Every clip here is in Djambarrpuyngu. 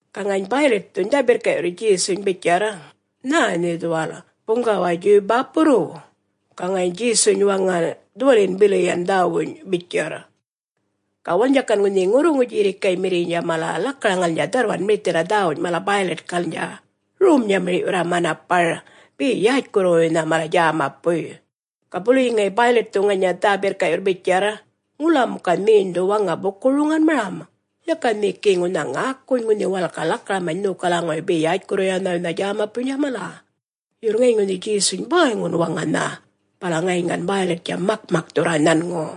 Ga ŋayiny Bäylitthuny dhä-birrka'yurr Djesuny bitjarr, “Nhä nhe dhuwal buŋgawa Djuw-bäpurruw?” Ga ŋayiny Djesuny waŋan, “Dhuwaliyin bili yan dhäwuny,” bitjarr. Ga walalnydja gan ŋunhi ŋurruŋu djirrikaymirriynydja mala lakaraŋalnydja dharrwan mirithirra dhäwuny mala Bäylitkalnydja, rom-nyamir'yurra manapar be yätjkurruwuynha mala djämapuy. Ga buluyi ŋayi ŋunhi Bäylitthu ŋanya dhä-birrka'yurr bitjarr, “Ŋula muka nheny dhu waŋa buku-roŋanmaram? Yaka nhe gi ŋunha ŋäkuny, ŋunha walal ga lakaramany nhokalaŋuwuy be yätjkurruwuynha djämapuynydja mala?” Yurr ŋayiny ŋunhi Djesuny bäyŋun waŋanha, bala ŋayiny gan Bäylittja makmakthurra nhanŋu.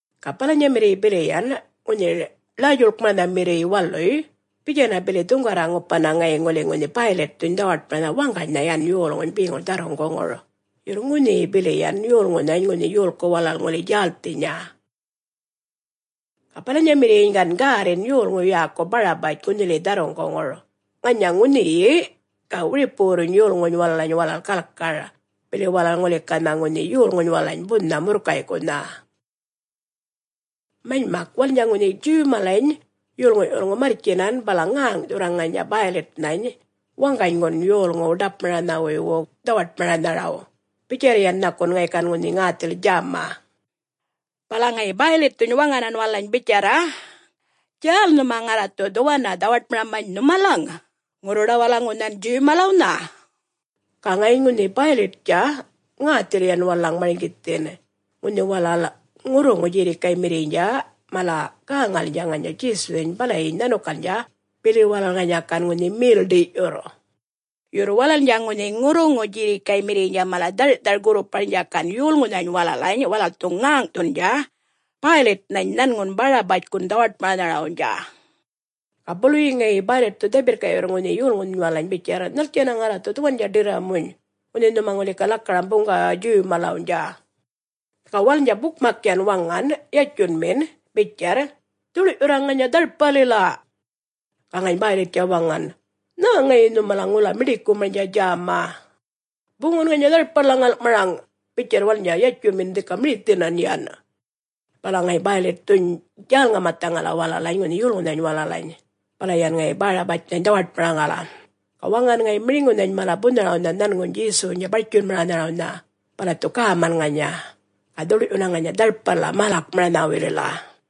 Ga balanyamirriy bili yan ŋunhi Ḻäy-djuḻkmaranhamirriy waluy bitjanna bili dhuŋgarra-ŋupanna ŋayiny ŋuli ŋunhi Bäylitthuny dhawaṯmaranha waŋganynha yan yolŋuny beŋur dharruŋguŋur, yurr ŋunhiyi bili yan yolŋunhany ŋunhi yolku walal ŋuli djälthinya. Ga balanyamirriyyiny gan gärrin yolŋu yäku Barabatj, ŋunhiliyi dharruŋguŋur. Ŋanya ŋunhiyi, ga wiripuwurruny yolŋuny walalany walal galkar, bili walal ŋuli ganha ŋunhi yolŋuny walalany bunha murrkay'kunha. Manymak walalnydja ŋunhi Djuw malany yolŋu'-yulŋu marrtjinan bala ŋäŋ'thurra ŋanya Bäylitnhany waŋganygun yolŋuw ḏapmaranhawuywu dhawaṯmaranharaw, bitjarr yan nhakun ŋayi gan ŋunhi ŋäthil djäma. Bala ŋayi Bäylitthuny waŋanan walalany bitjarra, “Djäl nhuma ŋarra dhu dhuwanna dhawaṯmaramany nhumalaŋ! … Ŋurruḏawalaŋunhan, Djuw malawnha?” Ga ŋayiny ŋunhi Bäylittja ŋäthil yan walalaŋ marŋgithin ŋunhi walal ŋurruŋu djirrikaymirriynydja mala gäŋalnydja ŋanya Djesunhany balayiny nhanukalnydja, bili walal ŋanya gan ŋunhi mel-ḏiy'yurr. Yurr walalnydja ŋunhi ŋurruŋu djirrikaymirriynydja mala dhar'thar-gurruparnydja gan yolŋunhany walalany walal dhu ŋäŋ'thundja Bäylitnhany nhanŋun Barabatjkun dhawaṯmaranharawnydja. Ga buluyi ŋayi Bäylitthu dhä-birrka'yurr ŋunhi yolŋuny walalany bitjarr, “Nhaltjanna ŋarra dhu dhuwandja ḏirramuny, ŋunhi nhuma ŋuli ga lakaram buŋgawa Djuw malawnydja?” Ga walalnydja bukmak yan waŋan yatjunmin bitjarr, “Dhuḻ'yurra ŋanya dharpalila!” Ga ŋayiny Bäylittja waŋan, “Nhä ŋayi nhumalaŋ ŋula miḏikumarnydja djäma?” “Buŋun ŋanya dharpalila ŋal'maraŋ,” bitjarr walalnydja yatjunmin dhika mirithinan yan. Bala ŋayiny Bäylitthuny djäl-ŋamathaŋala walalany ŋunhi yolŋunhan walalany. Bala yan ŋayi Barabatjnhany dhawaṯmaraŋala. Ga waŋan ŋayi miriŋunhany mala bunharawnha nhanŋuny Djesuwnydja bartjunmaranharawnha, bala dhu gäman ŋanya, ga dhuḻ'yunna ŋanya dharpalila mälakmaranhawuylila.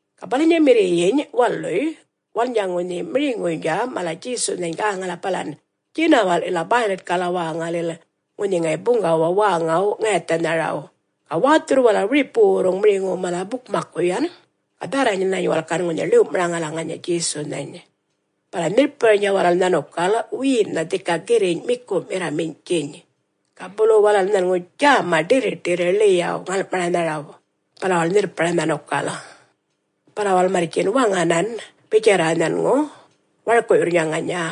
Ga balanyamirriyiny waluy walalnydja ŋunhi miriŋuynydja mala Djesunhany gäŋala balan djinawa'lila Bäylitkala wäŋalil, ŋunhi ŋayi buŋgawa wäŋaw-ŋayathanharaw, ga wäthurr walal wiripuwurruŋ miriŋuw mala bukmakku yan, ga dhärranany walal gan ŋunhi ḻiw'maraŋala ŋanya Djesunhany. Bala nhirrparnydja walal nhanukal wiyinnha dhika girriny' miku'mirra miny'tjiny, ga bulu walal nhanŋu djäma ḏirriṯirri ḻiyaw ŋal'maranharaw, bala walal nhirrpara nhanukal. Bala walal marrtjin waŋanany bitjarra nhanŋu, warku'yurrnydja ŋanya,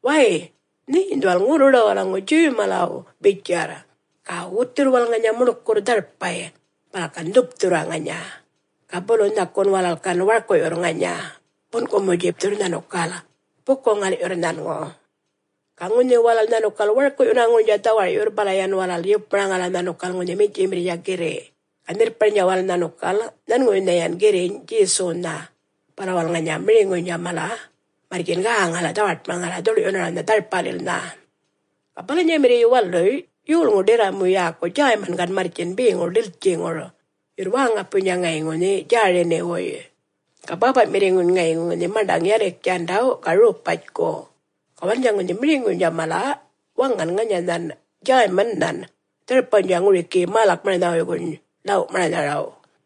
“Way, nheny dhuwal ŋurruḏawalaŋu Djuw malaw,” bitjarr. Ga wutthurr walal ŋanya muḻkurr dharpay bala gan dhupthurra ŋanya. Ga bulu nhakun walal gan warkuyurr ŋanya, bun'kumu-djipthurr nhanukal buku-ŋal'yurr nhanŋu. Ga ŋunhi walal nhanukal warku'yunaŋurnydja dhawar'yurr, bala yan walal yupmaraŋala nhanukal ŋunhi miny'tjimirrnydja girri' ga nhirrparnydja walal nhanukal nhanŋuwuynha yan girriny' Djesuwnha, bala walal ŋanya miriŋuynydja mala marrtjin gäŋala dhawaṯmaraŋala dhuḻ'yunarawnha dharpalilnha. Ga balanyamirriy waluy yolŋu ḏirramu yäku Djäyman gan marrtjin beŋur ḏiltjiŋur, yurr wäŋapuynydja ŋayi ŋunhi Djäriniwuy. Ga bäpa'mirriŋuny ŋayi ŋunhi maṉḏaŋ Yaliktjandaw ga Ropatjku. Ga walalnydja ŋunhi miriŋuynydja mala waŋan ŋanyanhan Djäymannhan dharpawnydja ŋurikiyi mälakmaranhawuywuny ḻaw'maranharaw.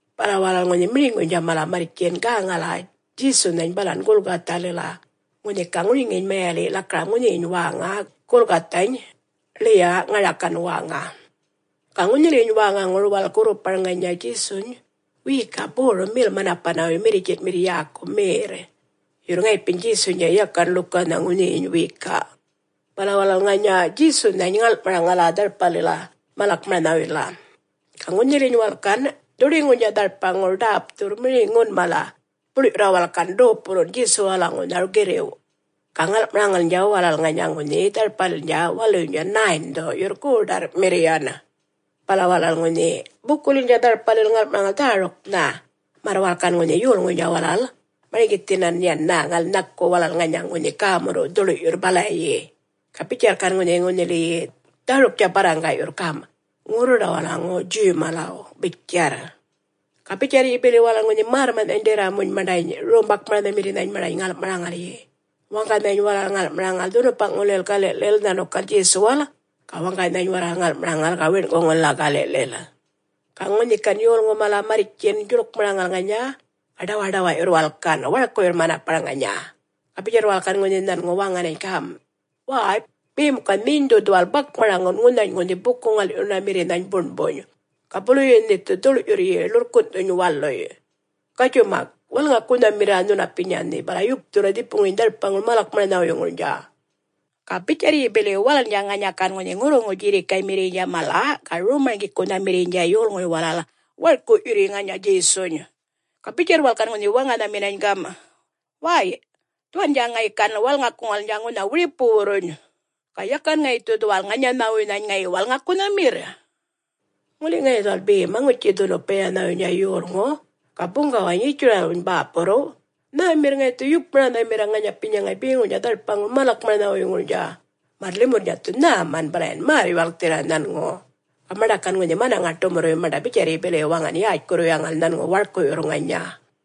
Bala walal ŋunhi miriŋuynydja mala marrtjin gäŋal Djesunhany balan Gulkathalila, ŋunhi ga ŋuriŋiyiny mayaliy' lakaram ŋunhiyiny wäŋa Gulkathany, “Ḻiya Ŋarakan wäŋa”. Ga ŋunhiliyiny wäŋaŋur walal gurrupara ŋanya Djesuny wiyika borum mel-manapanawuy mirritjin'mirr yäku merr. Yurr ŋayipiny Djesuynydja yakan ḻukanha ŋunhiyiny wiyika. Bala walal ŋanya Djesunhany ŋal'maraŋala, dharpalila mälakmaranhawuylila. Ga ŋunhiliyiny walal gan dhuḏiŋurnydja dharpaŋur ḏäpthurr miriŋun mala, buḻ'yurra walal gan dopulun Djesuwalaŋuwnha girriw'. Ga ŋal'maraŋalnydja walal ŋanya ŋunhi dharpalilnydja waluynydja 9-dhu yurr goḏarrmirr yan. Bala walal ŋunhi bukulilnydja dharpalil ŋal'maraŋal dhäruknha, märr walal gan ŋunhi yolŋuny walal marŋgithinan yan ŋunhi nhaku walal ŋanya ŋunhi gämurruw' dhuḻ'yurr balayi. Ga bitjarr gan ŋunhili dhäruktja barraŋga'yurr gam', “Ŋurruḏawalaŋu Djuw malaw,” bitjarr. Ga bitjarryi bili walal ŋunhi märrma'nhany ḏirramuny maṉḏany rom-bakmaranhmirrinhany maṉḏany ŋal'maraŋalyi, waŋganynhany walal ŋal'maraŋal dhunupa'ŋulil gali'lil nhanukal Djesuwal, ga waŋganynhany walal ŋal'maraŋal ga wiṉ'kuŋulila gali'lil. Ga ŋunhi gan yolŋu mala marrtjin djuḻkmaraŋal ŋanya, ga ḏawaḏawa'yurr walal gan, warku'yurr manapar ŋanya. Ga bitjarr walal gan nhanŋu ŋunhi waŋanany gam', “Wäy! Be muka nheny dhu dhuwal bakmaraŋun ŋunhany ŋunhi buku-ŋal'yunamirrinhany buṉbuny, ga buluyi nhe dhu dhuḻ'yurryi ḻurrkun'thuny waluy. Gatjuy mak walŋakunhamirra nhunapinya nhe, bala yupthurra dhipuŋuryiny dharpaŋur mälakmaranhawuyŋurnydja.” Ga bitjarryi bili walalnydja ŋanya gan ŋunhi ŋurruŋu djirrikaymirriynydja mala ga rom-marŋgikunhamirriynydja yolŋuy mala warku'yurryi ŋanya Djesuny. Ga bitjarr walal gan ŋunhi waŋanhaminany gam', “Way, dhuwandja ŋayi gan walŋakuŋalnydja ŋunha wiripuwurruny? … ga yakan ŋayi dhu dhuwal ŋanyanhawuynhany ŋayi walŋakunhamirr?” Ŋuli ŋayi dhuwal be Maŋutji-dhunupayanhawuynydja Yolŋu, ga Buŋgawany Yitjuralwuny bäpurruw, nhämirr ŋayi dhu yupmaranhamirra ŋanyapinya ŋayi beŋurnydja dharpaŋur mälakmaranhawuyŋurnydja, märr limurrnydja dhu nhäman bala yan märr-yuwalkthirra nhanŋu. Ga maṉḏa gan ŋunhi manaŋa-ḏumurruy maṉḏa bitjarryi bili waŋan yätjkurruyaŋal nhanŋu warku'yurr ŋanya.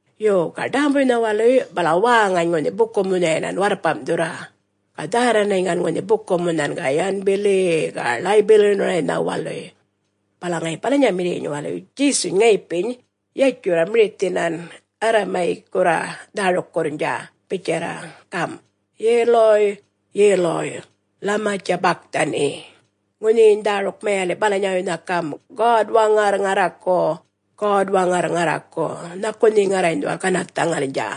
Yo. Ga ḏämbuynha waluy, bala wäŋany ŋunhi buku-munha'yinan warrpam'thurra, ga dhärranany gan ŋunhi buku-munhan', ga yan bili-i-i, ga ḻäy-bilyunaraynha waluy. Bala ŋayi balanyamirriyyiny waluy Djesuny ŋayipiny yatjurra mirithinan Arramayikkurra dhärukkurrnydja bitjarra gam', “Yeluy! Yeluy! Lama djabakthani?” Ŋunhiyiny dhäruk mayali' balanyawuynha gam', “God-Waŋarr ŋarraku! God-Waŋarr ŋarraku! Nhaku nhe ŋarrany dhuwal ganarrthaŋalnydja?”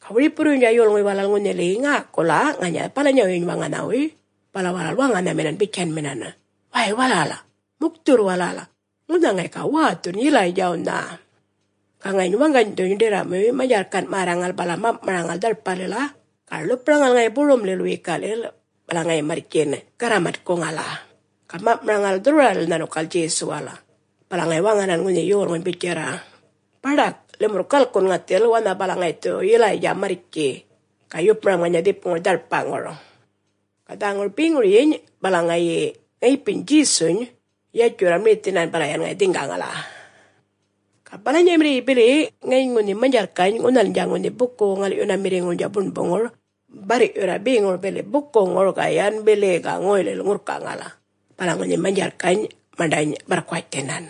Ga wiripuwurruynydja yolŋuy walal ŋunhili, ŋäkula ŋanya balanyawuyyiny waŋanhawuy bala walal waŋanhaminan bitjanminan, “Way walal, mukthurr walal. Ŋunha ŋayi ga wäthun Yilaydjawnha!” Ga ŋayiny waŋganydhuny ḏirramuy manydjarrkan' märraŋal bala mam'maraŋal dharpalila ga ḻupmaraŋal ŋayi borumlil wiyika'lil, bala yan marrtjin garramatkuŋala, ga mam'maraŋal dhurrwaralila nhanukal Djesuwal. Bala ŋayi waŋanan ŋunhi yolŋuny bitjarra, “Baḏak limurr galkun ŋathil wanha balaŋ ŋayi dhu Yilaydja marrtji, ga yupmaram ŋanya dhipuŋur dharpaŋur.” Ga dhäŋur beŋuryiny, bala yan ŋayipiny Djesuny yatjurr mirithinan bala yan ŋayi dhiŋgaŋala. Ga balanyamirriyyi bili ŋayiny ŋunhi manydjarrkany' ŋunhalnydja ŋunhi buku-ŋal'yunamirriŋurnydja buṉbuŋur barr'yurra beŋur bili bukuŋur ga yan bili-i-i ga ŋoylil ŋurrkaŋal, bala ŋunhi manydjarrkany' maṉḏany barrkuwatjthinan.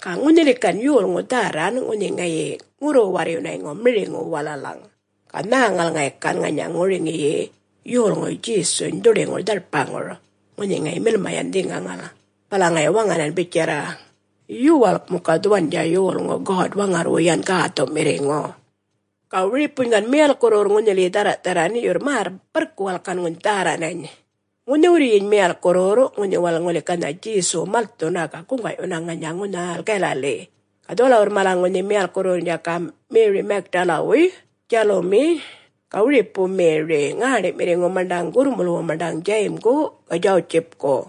Ga ŋunhiliyi gan yolŋu dhärran ŋunhi ŋayi ŋurru-warryunayŋu miriŋuw walalaŋ, ga nhäŋal ŋayi gan ŋanya ŋuriŋiyi yolŋuy Djesuny dhuḏiŋur dharpaŋur ŋunhi ŋayi milma yan dhiŋgaŋal, bala ŋayi waŋanan bitjarra, “Yuwalk muka dhuwandja yolŋu God-Waŋarrwu yan Gäthu'mirriŋu.” Ga wiripuny gan miyalkkurruwurr ŋunhiliyi dhärra'-dharran, yurr märr barrku walal gan ŋunhi dhärranany. Ŋunhiwurryiny miyalkkurruwurr ŋunhi walal ŋuli ganha Djesuw malthuna ga guŋga'yuna ŋanya ŋunhal Galali. Ga dhuwalawurr mala ŋunhi miyalkkurruwurrnydja gam', Meri Magdalawuy, Djalumi, ga wiripu Meri, ŋäṉḏi'mirriŋu maṉḏaŋ gurrmulwu maṉḏaŋ Djayimgu ga Djawutjipku.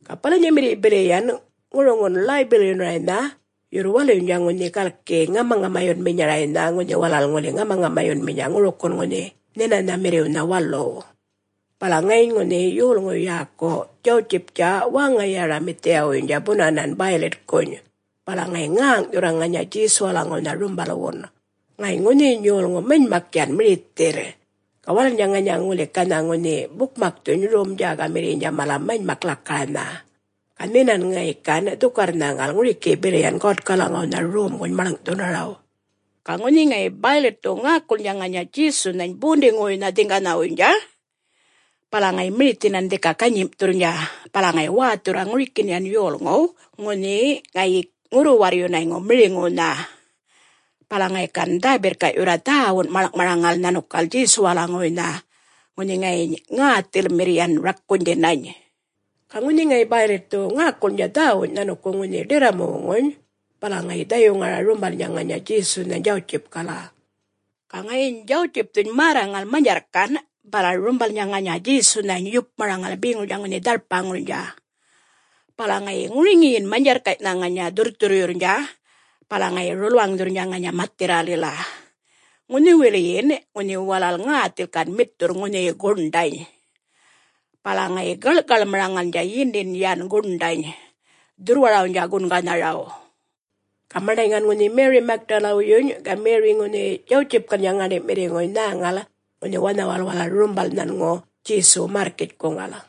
Ga balanyamirriy bili yan ŋuruŋun ḻäy-bilyunaraynha, yurr waluynydja ŋunhi galki ŋamaŋamayunaminyaraynha ŋunhi walal ŋuli ŋamaŋamayunminya ŋurikin ŋunhi Nhinanhamirriwnha waluw. Bala ŋayiny ŋunhi yolŋu yäku Djawutjiptja wäŋa Yaramathiyawuynydja bunanan Bäylitkuny, bala ŋayi ŋäŋ'thurra ŋanya Djesuwalaŋuwnha rumbalwun. Ŋayiny ŋunhiyiny yolŋu manymak yan mirithirr. Ga walalnydja ŋanya ŋuli ganha ŋunhi bukmakthuny rom-djägamirriynydja mala manymak lakaranha, ga nhinan ŋayi gan dhukarr-nhäŋal ŋurikiyi bili yan Godkalaŋuwnha Romguny maḻŋ'thunaraw. Ga ŋunhi ŋayi Bäylitthu ŋäkulnydja ŋanya Djesunhany bondiŋuwuynha dhiŋganhawuynydja, bala ŋayi mirithinan dhika ganyim'thurrnydja, bala ŋayi wäthurra ŋurikin yan yolŋuw ŋunhi ŋayi ŋurru-warryunayŋu miriŋuwnha, bala ŋayi gan dhä-birrka'yurra dhäwun maḻŋ'maraŋal nhanukal Djesuwalaŋuwuynha ŋunhi ŋayiny ŋäthilmirr yan rakunydhinany. Ga ŋunhi ŋayi Bäylitthu ŋäkulnydja dhäwuny nhanukuŋ ŋunhi ḏirramuwuŋuny, bala ŋayi dhayuŋara rumbalnydja ŋanya Djesunhany Djawutjipkala. Ga ŋayiny Djawutjipthuny märraŋal manydjarrkan', bala rumbalnydja ŋanya Djesunhany yupmaraŋala beŋuryiny ŋunhi dharpaŋurnydja. Bala ŋayi ŋuriŋiyin manydjarrkay'nha ŋanya dhurrthurryurrnydja bala ŋayi rulwaŋdhurrnydja ŋanya mathirralila, ŋunhiwiliyin ŋunhi walal ŋäthil gan mitthurr ŋunhiyi guṉḏany. Bala ŋayi gaḻ'kaḻmaraŋalnydja yindin yan guṉḏany dhurrwarawnydja gunganharaw. Ga maṉḏany gan ŋunhi Meri Magdalawuyyuny ga Meriy ŋunhi Djawutjipkalnydja ŋäṉḏi'mirriŋuy nhäŋal, ŋunhi wanhawal walal rumbal nhanŋu Djesuw märrkitjkuŋal.